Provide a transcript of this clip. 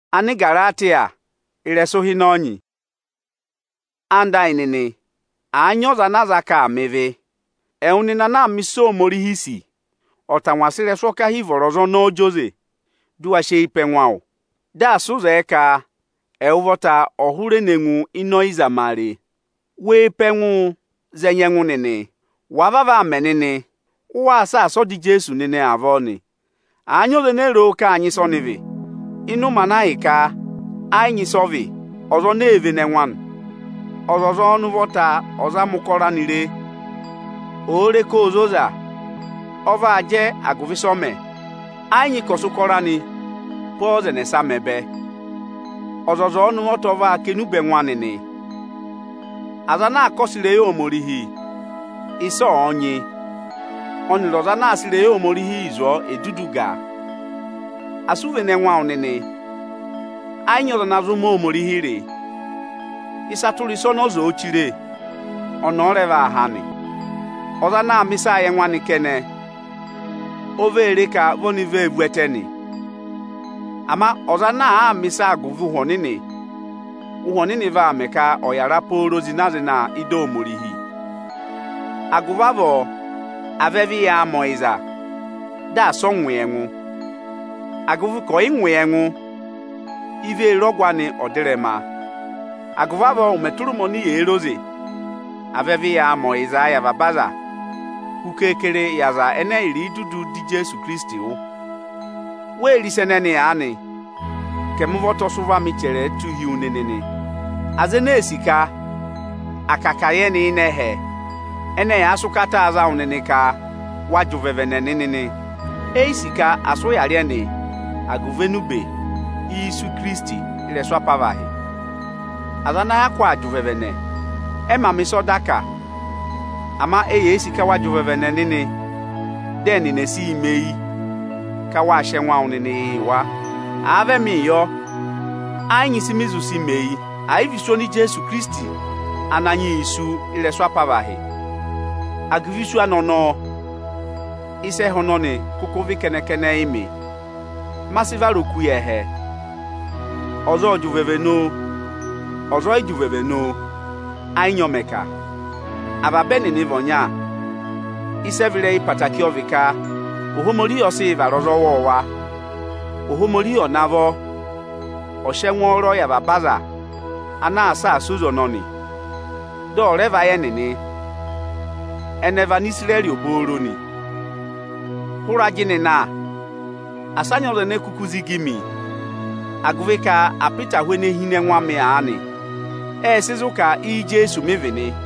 Waa gụ ẹngụụ ụvọ nịnị! Ẹwụ nịnị ẹyịnyara amị, àa nyị ọza ana a za ka aa mẹ ịvị, ẹwụ nịnị ana aa mẹ ịsị Ohomorihi sì, ọ̀ tangwa sị ịrẹsụ ọkahi vọrọ ọza ọnọọ zị oze! Dụ wa sị eyi pe ẹngụ awụ, dị asị ụ zẹẹ ka ẹwụ ụvọta ọ̀ hụrẹ ne ngụ ịnị ọyịzamare! Wee pe ẹngụụ za ẹnya ẹngụ nịnị! Wàa vavọọ aa mẹ nịnị, waa saasa ọda Ijeesu nịnị avọọ nị. Àa nyị ọza ene ro ka áa nyị ịsị ọnị vị, ịnị ụmẹ ana ahịka ẹ yị nyị ịsị ọ vị, ọza ọnọọ ee vene ẹngụ anị. Ọzọza ọnị ụvọta ọ̀ zama ụkọrọ anị re; òo re ka óo zoza, ọ vaa jẹ agụvị ịsị ọ mẹ; ẹ yị nyị ka ọ̀ sị ụkọrọ anị pe ọ́ọza ẹnẹsa mọ ẹbẹ. Ọzọza ọnị ụvọta ọ vaa kà enube ẹngụ anị nị. Aza ana aa kọsẹ ịrẹyị Ohomorihi, ịsị ọ̀ọ nyị, ọnịrị ọza ana aa sị ịrẹyị Ohomorihi zụ̀ ọọ è dudu gàa! Asị u vene ẹngụ awụ nịnị! ẹ yị nyị ọza ana zụ mẹ Ohomorihi rị. Ịsa tụra ịsa ọnị ọza òo chire, ọnị ọ rẹ vaa há nị. Ọza ana aa mẹ̀ ịsaa yị ẹngụ anị kẹnẹ, o vee re ka vi oni vee vu ẹtẹ nị. Ama ọza ana àaa mẹ̀ ịsa agụvị Ụhwẹ Ọnịnị, Ụhwẹ Ọnịnị vaa mẹ ka ọ̀ yàra pooro zịna-zịna ị́da Ohomorihi. Agụvị avọọ à vẹ vị yaa mẹ ọyịza, dị asị ọ ngụ yị ẹngụ! Agụvị ka ọ̀yị ngụ yị ẹngụ, i vee re ọgụ anị ọdịrẹma. Agụvị avọọ ụmẹ tụra ụmẹ oni yèe re oze, à vẹ vị yaa mẹ ọyịzaa yị avaba aza, hu keekere yị aza ẹnẹ ẹyịrị dudu dọ Ijeesu Ikirisiti wụ́. Wee re ịsa ẹnẹnị aanị ka ẹmị ụvọta ọ sị ụvọ amị chẹrẹ tụ́ hi wu nịnị nị! Aza ene ee sì ka, à kà ka à yẹ ẹnị ịnị ẹhẹ, ẹnị ẹyaa sị ụkataa za wụ nịnị ka wa jị ụvẹvẹnẹ nịnị nị. Eyi sì ka à sị ụya rị ẹnị agụvị enube isu Ikirisiti ị́rẹsụ apavahị. Aza ana hyakụ aa jị ụvẹvẹnẹ, ẹ mā mẹ ịsị ọda kà, ama eyee sì ka wa jị ụvẹvẹnẹ nịnị, dị ẹnị ẹ̀ sịị mẹ eyi ka wáa sị ẹngụ awụ nịnị yị wa. Àa vị ẹmịị yọ, ẹ yị nyị ịsị mị zụ sị mẹ eyi, àyị vị isu oni Ijeesu Ikirisiti Ananyị yị sú ị́rẹsụ apavahị. Agụvị isu anị ọnọọ, ịsa ẹhẹ ọnọnị kụkụ vị kẹnẹ-kẹnẹ yị mị, ma sị vara oku yị ẹhẹ. Ọza ọ̀ọ jị ụvẹvẹnẹ oo, ọza ọ̀yị jị ụvẹvẹnẹ oo, ẹ yị nyị ọ mẹ̀ kà, avaba ẹnịnị vị ọnya. Ịsị ẹ vị ịrẹyị ẹtẹẹtẹrẹ ọ vị ka Ohomorihi ọ sị yị vara ọza ọwọọwa. Ohomorihi ọ̀ navọ ọ̀ sị ẹngwọọrọ yị avaba aza ana aa saasa oze ọnọnị, dị ọ̀ rẹ vayị ẹnịnị; ẹnị ẹ vị Anisirẹrị obooro nị. Hụrẹ ajịnị na, asa a nyị ọza ene kuku zigi mi, agụvị ka apịtahụ ene hi ịnị ẹngụ amị aanị, ẹ́ẹ sị zụ̀ ka Íjeesu mị vị nị.